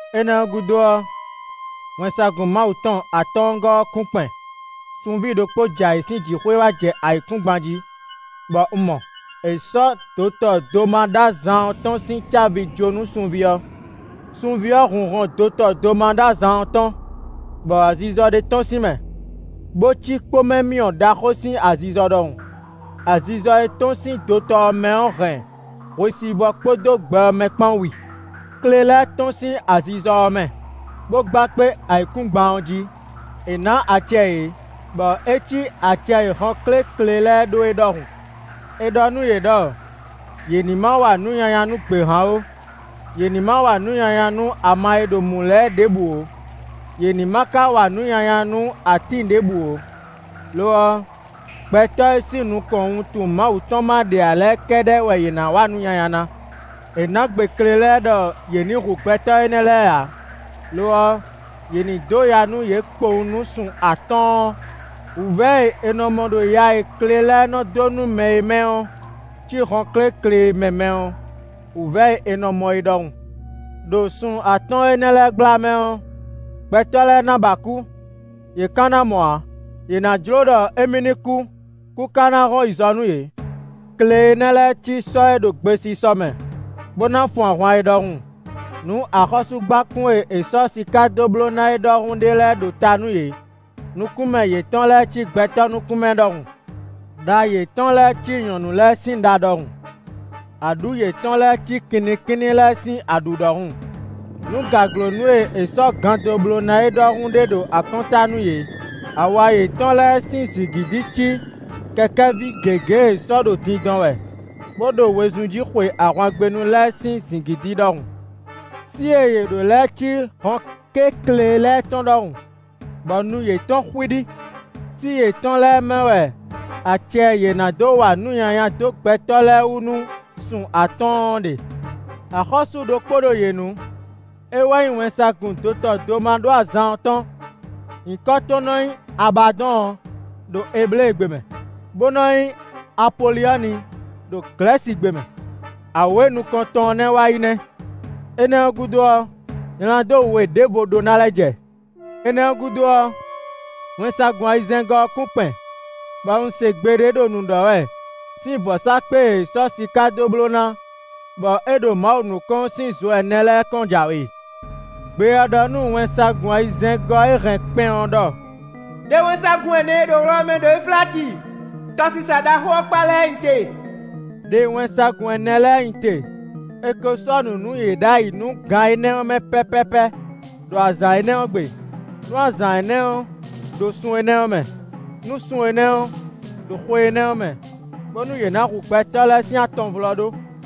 Énɛ́ ɔ́ gúdo ɔ́, wɛnsagun Mawu tɔn atɔ́ɔ́ngɔ́ ɔ́ kún kpɛn. Sunví ɖokpó j'ayǐ sín jǐxwé wá jɛ ayǐkúngban jí bɔ un mɔ; è sɔ́ dotɔ domaɖó-azan ɔ́ tɔn sín cávi jó nú sunví ɔ́. Sunví ɔ́ hun hɔn dotɔ domaɖó-azan ɔ́ tɔn, bɔ azizɔ ɖé tɔ́n sín mɛ, bó cí kpómɛmyɔ ɖaxó sín azizɔ ɖɔhun. Azizɔ e tɔ́n sín dotɔ ɔ́ mɛ ɔ́ hɛn hwesivɔ́ kpódó gbɛ ɔ́ mɛ kpán wi. Kle lɛ́ɛ tɔ́n sín azizɔ ɔ́ mɛ, bó gba kpé ayǐkúngban ɔ́ jí; è nǎ acɛ yě, bɔ é cí acɛ e hɔnkéklě lɛ́ɛ ɖó é ɖɔhun. È ɖɔ nú yě ɖɔ yě ní ma wa nǔ nyanya nú gběhan ó, yě ní ma wa nǔ nyanya nú ama e ɖo mǔ lɛ́ɛ ɖěbǔ ó; yě ní ma ka wa nǔ nyanya nú atín ɖěbǔ ó. Lo ɔ́, gbɛtɔ́ e sín nukɔn wuntun Mawu tɔn ma ɖe ǎ lɛ́ɛ kɛ́ɖɛ́ wɛ yě ná wa nǔ nyanya ná. È nǎ gbe kle lɛ́ɛ ɖɔ yě ní hu gbɛtɔ́ énɛ́ lɛ́ɛ ǎ; lo ɔ́, yě ní dó ya nú yě kpowun nú sun atɔ́ɔ́n. Wǔvɛ́ e è nɔ mɔ ɖo ya e kle lɛ́ɛ nɔ dó nú mɛ é mɛ ɔ́ cí hɔnkéklě mɛ mɛ ɔ́, wǔvɛ́ e è nɔ mɔ é ɖɔhun. Đo sun atɔ́ɔ́n énɛ́ lɛ́ɛ gbla mɛ ɔ́, gbɛtɔ́ lɛ́ɛ ná ba kú, yě ka ná mɔ ǎ; yě ná jló ɖɔ émí ní kú, kú ka ná hɔn yi zɔ nú yě. Kle énɛ́ lɛ́ɛ cí sɔ́ e ɖo gbesisɔ mɛ, bó ná fun ahwan é ɖɔhun; nǔ axɔ́súgbákún e è sɔ́ siká dó bló ná é ɖɔhun ɖé lɛ́ɛ ɖo ta nú yě; nukún mɛ yětɔn lɛ́ɛ cí gbɛtɔ́ nukún mɛ ɖɔhun. Đa yětɔn lɛ́ɛ cí nyɔ̌nu lɛ́ɛ sín ɖa ɖɔhun; aɖǔ yětɔn lɛ́ɛ cí kinnikínní lɛ́ɛ sín aɖǔ ɖɔhun. Nǔ gǎglónú e è sɔ́ gan dó bló ná é ɖɔhun ɖé ɖo akɔ́nta nú yě; awa yětɔn lɛ́ɛ sín zǐngídi cí kɛkɛ́ví gěgé e sɔ́ ɖo dindɔn wɛ, bó ɖo wezun jí xwe ahwangbénu lɛ́ɛ sín zǐngídi ɖɔhun. Sí e yě ɖó lɛ́ɛ cí hɔnkéklě lɛ́ɛ tɔn ɖɔhun, bɔ nu yětɔn xwíɖí. Sí yětɔn lɛ́ɛ mɛ wɛ acɛ e yě ná dó wa nǔ nyanya dó gbɛtɔ́ lɛ́ɛ wú nú sun atɔ́ɔ́n ɔ́ ɖe. Axɔ́sú ɖokpó ɖo yě nu; é wɛ nyí wɛnsagun dotɔ domaɖó-azan ɔ́ tɔn; nyǐkɔ tɔn nɔ nyí “Abadɔ́ɔn” ɖo Ebléegbe mɛ, bó nɔ nyí “Apolyɔ́ni” ɖo Glɛ̌sigbe mɛ. Awě nukɔntɔn ɔ́ nɛ́ wá yi nɛ́; énɛ́ ɔ́ gúdo ɔ́, nyladó we ɖěvo ɖó ná lɛ́ jɛ. Énɛ́ ɔ́ gúdo ɔ́, wɛnsagun ayizɛ́ngɔ́ ɔ́ kún kpɛn, bɔ un se gbe ɖé ɖo nǔ ɖɔ wɛ sín vɔ̌sákpe e è sɔ́ siká dó bló ná, bɔ é ɖo Mawu nukɔn ɔ́ sín zo ɛnɛ lɛ́ɛ kɔn jǎwe. Gbe ɔ́ ɖɔ nú wɛnsagun ayizɛ́ngɔ́ e hɛn kpɛn ɔ́ ɖɔ: “Đe wɛnsagun ɛnɛ e ɖo wlɔ mɛ ɖo Efláti, tɔsisa ɖaxó ɔ́ kpá lɛ́ɛ nyi te.” Đe wɛnsagun ɛnɛ lɛ́ɛ nyi te; è ko sɔ́ nǔ nú yě ɖ'ayǐ nú gan énɛ́ ɔ́ mɛ pɛ́pɛ́pɛ́, ɖo azǎn énɛ́ ɔ́ gbe, nú azǎn énɛ́ ɔ́ ɖo sun énɛ́ ɔ́ mɛ, nú sun énɛ́ ɔ́ ɖo xwe énɛ́ ɔ́ mɛ, bónú yě ná hu gbɛtɔ́ lɛ́ɛ sín atɔnvlɔ́ɖó.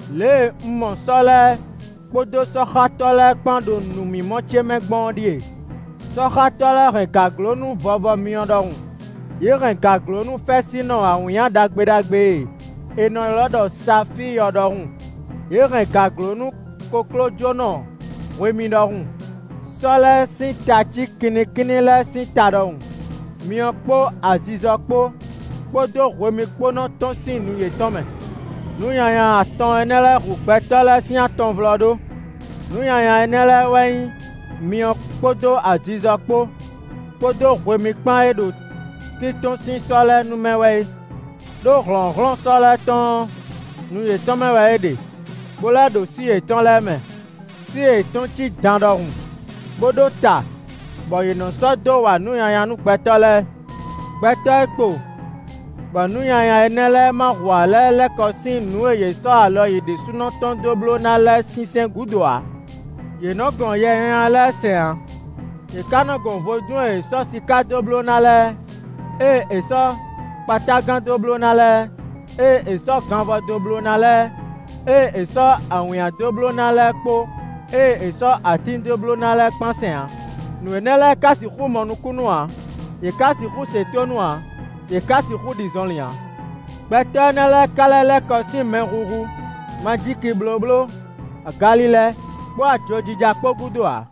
Lě e un mɔ sɔ́ lɛ́ɛ kpódó sɔ́xátɔ́ lɛ́ɛ kpán ɖo nǔmimɔ ce mɛ gbɔn ɔ́ ɖíe: sɔ́xátɔ́ lɛ́ɛ hɛn gǎglónú vɔvɔ myɔ ɖɔhun; yě hɛn gǎglónú fɛ́sinnɔ awǐnnya ɖagbe ɖagbe e è nɔ ylɔ́ ɖɔ Safíi ɔ́ ɖɔhun; yě hɛn gǎglónú koklójónɔ hwemí ɖɔhun; sɔ́ lɛ́ɛ sín ta cí kinnikínní lɛ́ɛ sín ta ɖɔhun; myɔ kpó azizɔ kpó, kpódó hwemí kpó nɔ tɔ́n sín nu yětɔn mɛ. Nǔ nyanya atɔn énɛ́ lɛ́ɛ hu gbɛtɔ́ lɛ́ɛ sín atɔnvlɔ́ɖó: nǔ nyanya énɛ́ lɛ́ɛ wɛ nyí myɔ kpódó azizɔ kpó, kpódó hwemí kpán e ɖo tíntɔ́n sín sɔ́ lɛ́ɛ nu mɛ wɛ é. Đó hlɔ̌nhlɔ́n sɔ́ lɛ́ɛ tɔn ɔ́, nu yětɔn mɛ wɛ é ɖe, bó lɛ́ ɖo sí yětɔn lɛ́ɛ mɛ; sí yětɔn cí dan ɖɔhun bó ɖó ta bɔ yě nɔ sɔ́ dó wa nǔ nyanya nú gbɛtɔ́ lɛ́ɛ. Gbɛtɔ́ e kpo bɔ nǔ nyanya énɛ́ lɛ́ɛ ma hu ǎ lɛ́ɛ lɛ́ kɔ sín nǔ e yě sɔ́ alɔ yě ɖésúnɔ tɔn dó bló ná lɛ́ɛ sinsɛn gúdo ǎ. Yě nɔ gɔn yɛ nyanya lɛ́ɛ sɛn ǎ; yě ka nɔ gɔn vodún e è sɔ́ siká dó bló ná lɛ́ɛ, ée è sɔ́ kpatágan dó bló ná lɛ́ɛ, ée è sɔ́ ganvɔ dó bló ná lɛ́ɛ, ée è sɔ́ awǐnnya dó bló ná lɛ́ɛ kpó ée è sɔ́ atín dó bló ná lɛ́ɛ kpán sɛn ǎ; nǔ énɛ́ lɛ́ɛ ka sixú mɔ nukúnnú ǎ; yě ka sixú se tónú ǎ; yě ka sixú ɖi zɔnlin ǎ. Gbɛtɔ́ énɛ́ lɛ́ɛ ka lɛ́ lɛ́ kɔ sín mɛhuhu, majíkiblóbló, agalilɛ kpó ajojija kpó gúdo ǎ.